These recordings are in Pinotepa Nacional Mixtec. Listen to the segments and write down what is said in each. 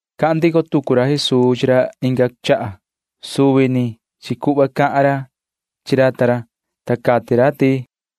Cahan ndico tucu ra Jesuu chi ra inga chaha. Suvi ni chi cuhva cahan ra chi ra ta ra, ta cati ra ti: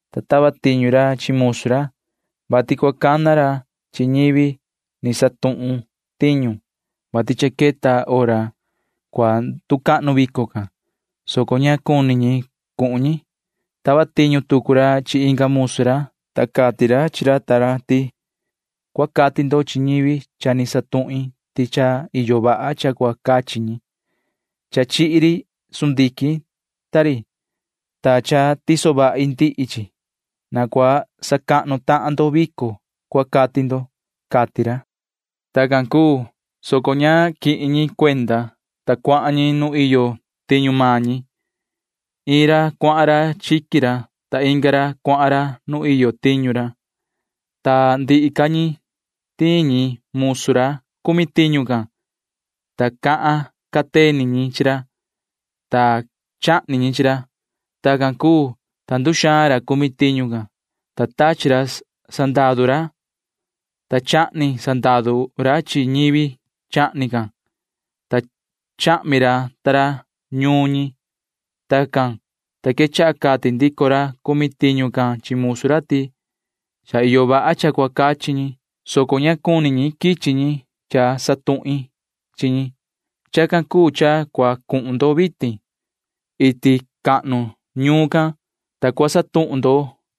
ta tava tiñu ra chi musu ra, vati cua cana ra chi ñivi ni cana ñahan ra cumi tiñu can, vati cha queta hora cua nducahnu vico can, soco ña cuni ñi cuhun ñi. Tava tiñu tucu ra chi inga musu ra, ta cati ra chi ra ta ra ti: “Cua cati ndo chi ñivi cha ni cana ñahin ti cha iyo vaha cha cua cachi ñi. Cha chihi ri sundiquin ta ri, ta cha tiso vahi ndihi chi. Na cua sacahnu tahan ndo vico, cua cati ndo,” cati ra. Tacan cuu, soco ña quihin ñi cuenda, ta cuahan ñi nu iyo tiñu maan ñi. Iin ra cuahan chiqui ra, ta inga ra cuahan nu iyo tiñu ra, ta ndihi ca ñi tiin ñi musu ra cumi tiñu can, ta cahan cateni ñi chi ra, ta chahni ñi chi ra. Tacan cuu, ta nduxaan ra cumi tiñu can, ta tachi ra sandaru, ta chahni ra sandaru ta ra chi ñivi chahni can, ta chahmi ra ta ra ñuun ñi. Tacan, ta quechaha cati ndico ra cumi tiñu can chi musu ra ti: “Cha iyo vaha cha cua cachi ñi, soco ña cuni quichi ñivi cha ni cana ñahin. Chacan cuu cha cua cuhun ndo vitin, ta iti yu ñuun cua cuhun ndo, ta cua cana ndo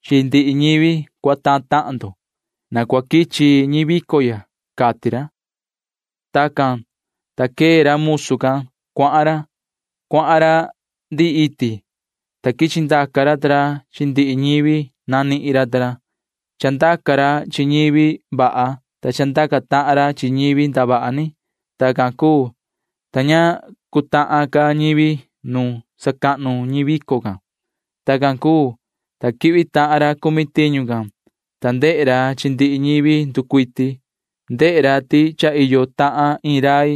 chi ndihi ñivi cuatahan tahan ndo. Na cua quichi ñi vico ya,” cati ra. Tacan, ta quee ra musu can cuahan ra. Cuahan ra ndihi iti, ta quichi ndaca ra ta ra chi ndihi ñivi nanihin ra ta ra. Chandaca ra chi ñivi vaha, ta chandaca tahan ra chi ñivi ndavaha ni. Tacan cuu, ta ña cutahan ca ñivi nu sacahnu ñi vico can. ’Tacan cuu, ta quihvi tahan ra cumi tiñu can, ta ndehe ra chi ndihi ñivi nducuiti. Ndehe ra ti cha iyo tahan iin rai,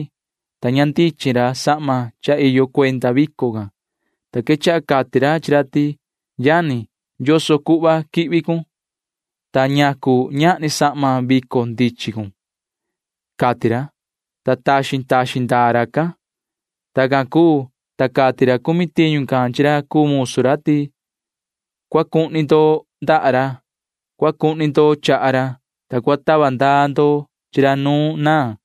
ta ña ndichin ra sahma cha iyo cuenda vico can, ta quechaha cati ra chi ra ti: “Yoho yani, ¿yoso cuhva quihvi cun, ta ñacu ñahni sahma vico ndichin cun?” cati ra, ta taxin taxin ndaa racan. Tacan cuu, ta cati ra cumi tiñu can chi ra cuu musu ra ti: “Cua cuhni ndo ndaha ra. Cua cuhni ndo chaha ra, ta cua tava ndaa ndo chi ra nu naan.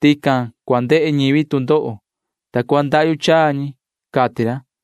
Tican cua ndehe ñivi tu ndoho, ta cua ndahyu chaa ñi,” cati ra.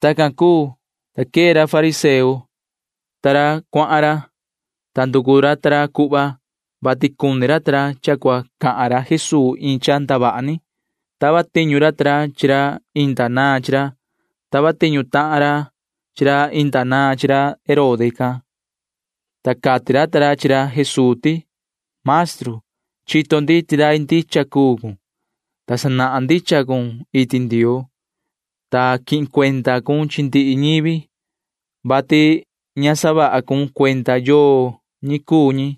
Tacan cuu, ta quee ra fariseo ta ra cuahan ra, ta nducu ra ta ra cuhva, vati cuni ra ta ra cha cua cahan ra Jesuu iin cha ndavaha ni. Tava tiñu ra ta ra chi ra inda naan chi ra. Tava tiñu tahan ra chi ra inda naan chi ra Herode, ta cati ra ta ra chi ra Jesuu ti: ―Yoho maestru, chito ndi ti rai ndicha cuun, ta sanahan ndicha cun iti Ndioo, ta quihin cuenda cun chi ndihi ñivi, vati ña sahun cuenda yoo ñi cuu ñi.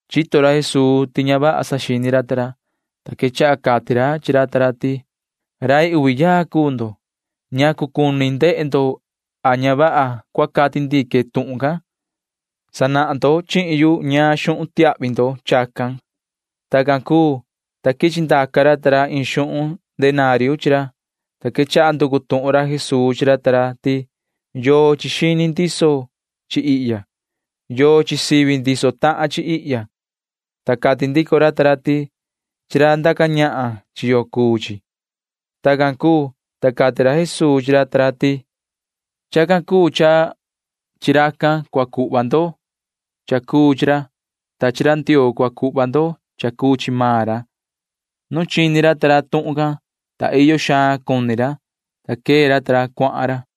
Chito ra Jesuu ti ña vaha saxini ra ta ra, ta sa quechaha cati ra chi ra ta ra ti: ―Rai uvi yaa cuu ndo. ¿Ñacu cuni ndehe ndo a ña vaha cua cati ndique tuhun can? Sanahan ndo chihin yu ñaan xuhun tiahvi ndo chacan ―cati ra. Tacan cuu, ta quichi ndaca ra ta ra iin xuhun denario chi ra, ta quechaha nducu tuhun ra Jesuu chi ra ta ra ti: ―¿Yochi xini ndiso chi ihya? ¿Yochi sivi ndiso tahan chi ihya? ―cati ra. Ta cati ndico ra ta ra ti: ―Chi ra ndaca ñahan chi yo cuu chi ―cati ra ta ra chi ra. Tacan cuu, ta cati ra Jesuu chi ra ta ra ti: ―Chacan cuu cha chi racan cua cuhva ndo cha cuu chi ra, ta chi ra Ndioo cua cuhva ndo cha cuu chi maan ra. Nu chini ra ta ra tuhun can, ta iyo xaan cuni ra, ta quee ra ta ra cuahan ra.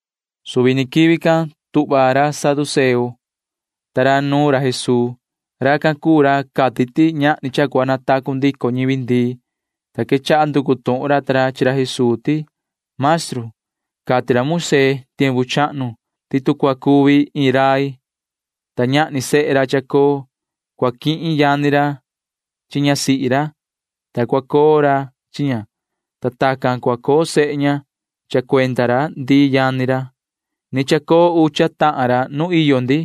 Suvi ni quivi can tuhva tahan ra saduceo ta ra nuun ra Jesuu. Racan cuu ra cati ti ñahni cha cua natacu ndico ñivi ndii, ta quechaha nducu tuhun ra ta ra chi ra Jesuu ti: ―Yoho maestru, cha cati ra Moisee tiempu chahnu ti tu cua cuvi iin rai, ta ñahni sehe ra chacoo, cua quihin yani ra chi ñasihi ra, ta cua coo ra chi ña, ta tacan cua coo sehe ña cha cuenda ra ndii yani ra. Ni chacoo ucha tahan ra nuun iyo ndi.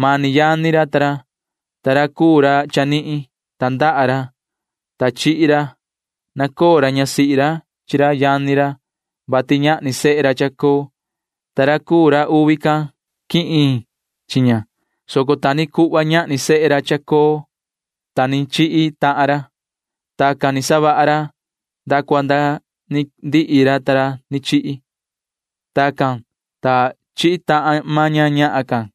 Mani yani ra ta ra, ta ra cuu ra chanihin―tandaha ra, ta chihi ra. Nacoo ra ñasihi ra chi ra yani ra, vati ñahni sehe ra chacoo, ta ra cuu ra uvi can quihin chi ña, soco ta ni cuhva ñahni sehe ra chacoo, ta ni chihi tahan ra. Tacan ni savaha ra nda cua nda ni ndihi ra ta ra ni chihi. Tacan, ta chihi tahan maan ña ñahan can.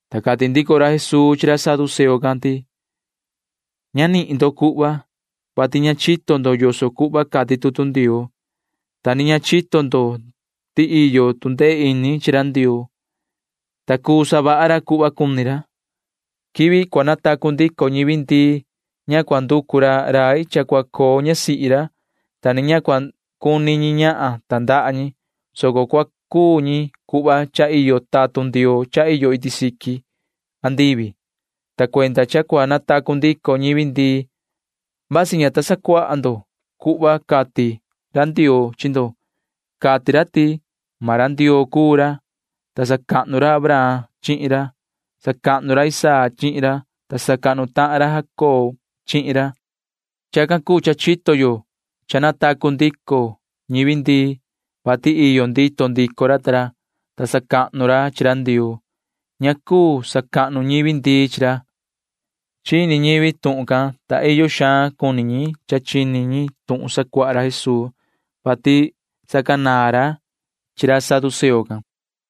Ta cati ndico ra Jesuu chi ra saduceo can ti: ―Ña nihin ndo cuhva, vati ña chito ndo yoso cuhva cati tutu Ndioo, ta ni ña chito ndo ti iyo tu ndee ini chi ra Ndioo, [ta cuu savaha ra cuhva cuni ra]. Quivi cua natacu ndico ñivi ndii ña cua nducu ra rai cha cua coo ñasihi ra, ta ni ña cua cuni ñi ñahan tandaha ñi, soco cua cuu ñi cuhva cha iyo tatun Ndioo cha iyo iti siqui andivi, ta cuenda cha cua natacu ndico ñivi ndii―vasi ña ta sacuaha ndo cuhva cati ra Ndioo chi ndo. maan ra Ndioo cuu ra, ta sacahnu ra Abraham chihin ra. Sacahnu ra Isaac chihin ra, ta sacahnu tahan ra Jacob chihin ra, cati ra. [Chacan cuu cha chito yo cha natacu ndico ñivi ndii,] vati iyo ndito ndico ra ta ra, ta sacahnu ra chi ra Ndioo. Ña cuu sacahnu ñivi ndii chi ra ―cati ra Jesuu chi ra saduceo ta ra. Chini ñivi tuhun can, ta iyo xaan cuni ñi cha chini ñi tuhun sacuaha ra Jesuu, [vati sacanaan ra chi ra saduceo can].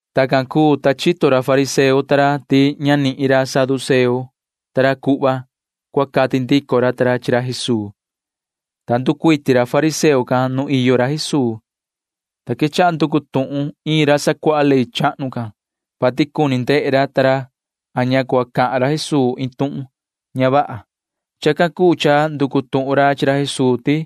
Tacan cuu, ta chito ra fariseo ta ra ti ña nihin ra saduceo ta ra cuhva cua cati ndico ra ta ra chi ra Jesuu, ta nducuiti ra fariseo can nu iyo ra Jesuu, ta quechaha nducu tuhun iin ra sacuaha ley chahnu can, vati cuni ndehe ra ta ra a ña cua cahan ra Jesuu iin tuhun ña vaha. Chacan cuu cha nducu tuhun ra chi ra Jesuu ti: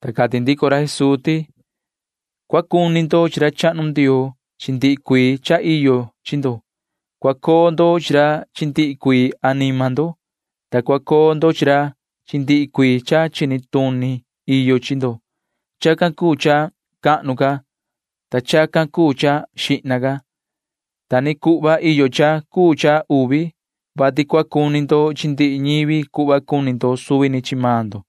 Ta cati ndico ra Jesuu ti: ―Cua cuni ndo chi ra chahnu Ndioo chi ndihi cuii cha iyo chi ndo. Cua coo ndo chi ra chi ndihi cuii anima ndo, ta cua coo ndo chi ra chi ndihi cuii cha chini tuni cha iyo chi ndo. Chacan cuu cha cahnu ca, ta chacan cuu cha xihna ca. Ta ni cuhva iyo cha cuu cha uvi, vati cua cuni ndo chi ndihi ñivi cuhva cuni ndo suvi ni chi maan ndo.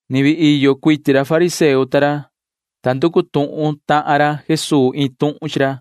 Ni vii iyo cuiti ra fariseo ta ra, ta nducu tuhun tahan ra Jesuu iin tuhun chi ra.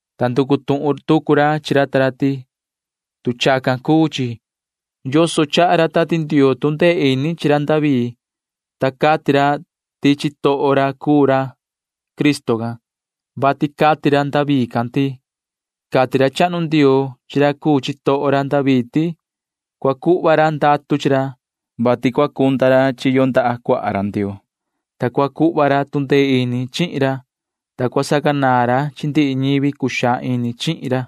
Ta nducu tuhun tucu ra chi ra ta ra ti: ―Tu chacan cuu chi, ¿yoso chaha ra Tati Ndioo tu ndee ini chi ra David, ta cati ra ti chitoho ra cuu ra cuu Cristo can?, vati cati ra David can ti: Cati ra chahnu Ndioo chi ra cuu chitoho ra David ti [cua cuhva ra ndatu chi ra,] vati cua cunda ra chiyo ndaha cuaha ra Ndioo, [ta cua cuhva ra tu ndee ini chihin ra,] ta cua sacanaan ra chi ndihi ñivi cuxaan ini chihin ra,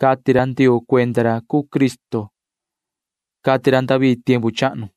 cati ra Ndioo cuenda ra cuu Cristo, cati ra David tiempu chahnu.